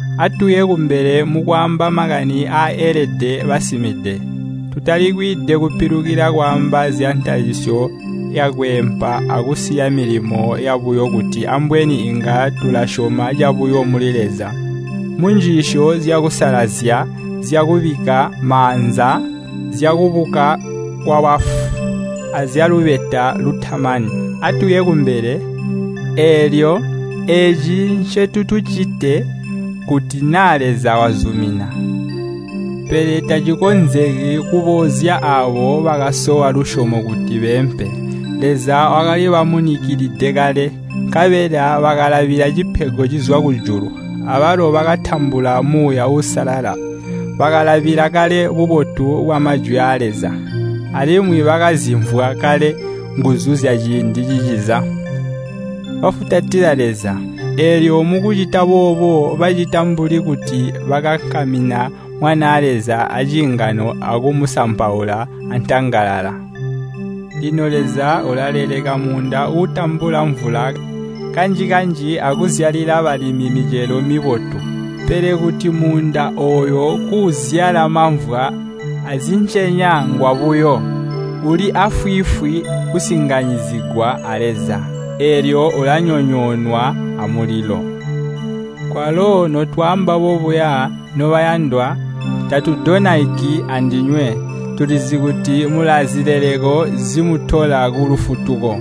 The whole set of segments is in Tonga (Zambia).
Atuye kumbele mukwaamba makani aaelede basimide. Tutali kwiide kupilukila kwaamba zyantalisyo yakweempa akusiya milimo yabuyo kuti ambweni iinga tulasyoma cabuyo muli Leza, munjiisyo zyakusalazya, zyakubikka maanza, zyakubuka kwabafu, azyalubeta lutamani. Atuye kumbele! Eelyo, eeci ncotuticite kuti naa Leza wazumina. Pele tacikonzeki kuboozya aabo bakasowa lusyomo kuti beempe. Leza wakalibamunikilide kale, nkabela bakalabila cipego cizwa kujulu, abalo bakatambula Muuya Uusalala. Bakalabila kale bubotu bwa Majwi aa Leza, alimwi bakazimvwa kale nguzu zyaciindi ciciza. Bafutatila Leza, eelyo mukucita boobo bacita mbuli kuti bakankamina Mwanaa Leza aciingano akumusampaula antangalala. Lino Leza ulaleleka muunda uutambula mvula kanji-kanji akuzyalila balimi micelo mibotu. Pele kuti muunda ooyo kuuzyala mamvwa azincenya ngwabuyo. Uli aafwiifwi kusinganyizigwa a Leza, eelyo ulanyonyoonwa amulilo. Kwalo notwaamba bobuya, nobayandwa, tatudonaiki andinywe. Tulizi kuti mulaazileleko zimutola kulufutuko.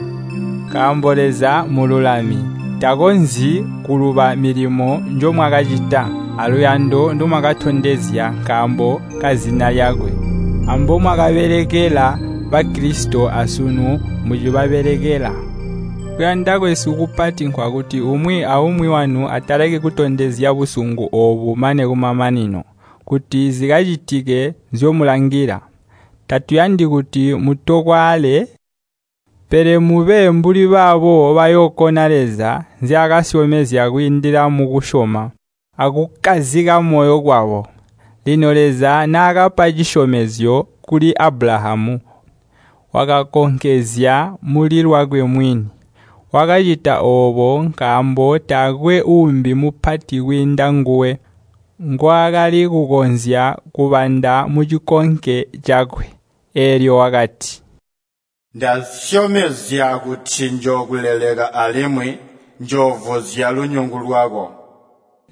Nkaambo Leza mmululami. Takonzyi kuluba milimo njomwakacita, aluyando ndomwakatondezya nkaambo kazina lyakwe, ambomwakabelekela Bakilisito asunu mucibabelekela. Kuyanda kwesu kupati nkwakuti umwi aumwi wanu ataleki kutondezya busungu oobu mane kumamanino, kuti zikacitike nzyomulangila. Tatuyandi kuti mutokwaale, pele mube mbuli baabo bayookona Leza nzyaakasyomezya kwiindila mukusyoma akukkazika moyo kwabo. Lino Leza naakapa cisyomezyo kuli Abulahamu, wakakonkezya muli lwakwe mwini. Wakacita oobo nkaambo taakwe uumbi mupati kwiinda nguwe ngwaakali kukonzya kubanda mucikonke cakwe. Eelyo wakati, “Ndasyomezya kuti njookuleleka alimwi njoovuzya lunyungu lwako.”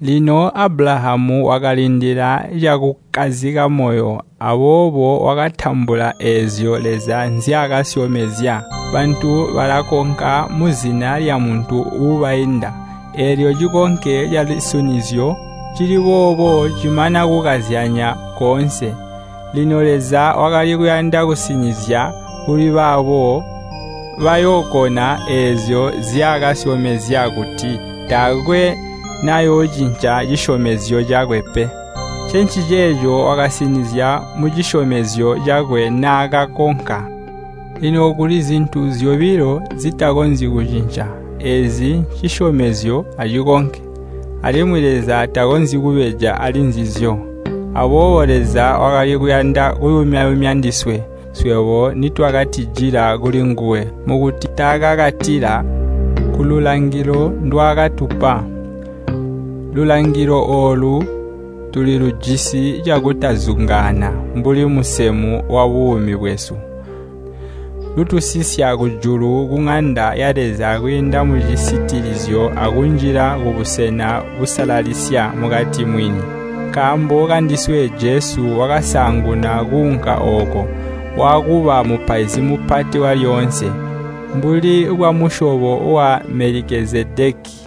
Lino Abulahamu wakalindila cakukkazika moyo, aboobo wakatambula eezyo Leza nzyaakasyomezya. Bantu balakonka muzina lyamuntu uubainda, eelyo cikonke calusinizyo cili boobo cimana kukazyanya koonse. Lino Leza wakali kuyanda kusinizya kuli baabo bayookona eezyo nzyaakasyomezya kuti taakwe nayoocinca cisyomezyo cakwe pe. Ncenciceeco wakasinizya mucisyomezyo cakwe naakakonka. Lino kuli zintu zyobilo, zitakonzyi kucinca, eezi ncisyomezyo acikonke, alimwi Leza takonzyi kubeja ali nzizyo. Aboobo Leza wakali kuyanda kuyumya-yumya ndiswe, swebo nitwakatijila kulinguwe, mukuti tukakatile kululangilo ndwaakatupa. Lulangilo oolu tulilujisi cakutazungaana mbuli musemu wabuumi bwesu. Lutusisya kujulu kuŋanda ya Leza kwiinda mucisitilizyo akunjila kubusena busalalisya mukati mwini. Nkaambo kandiswe Jesu wakasaanguna kuunka ooko, waakuba Mupaizi Mupati walyoonse, mbuli bwamusyobo wa Melikezedeki.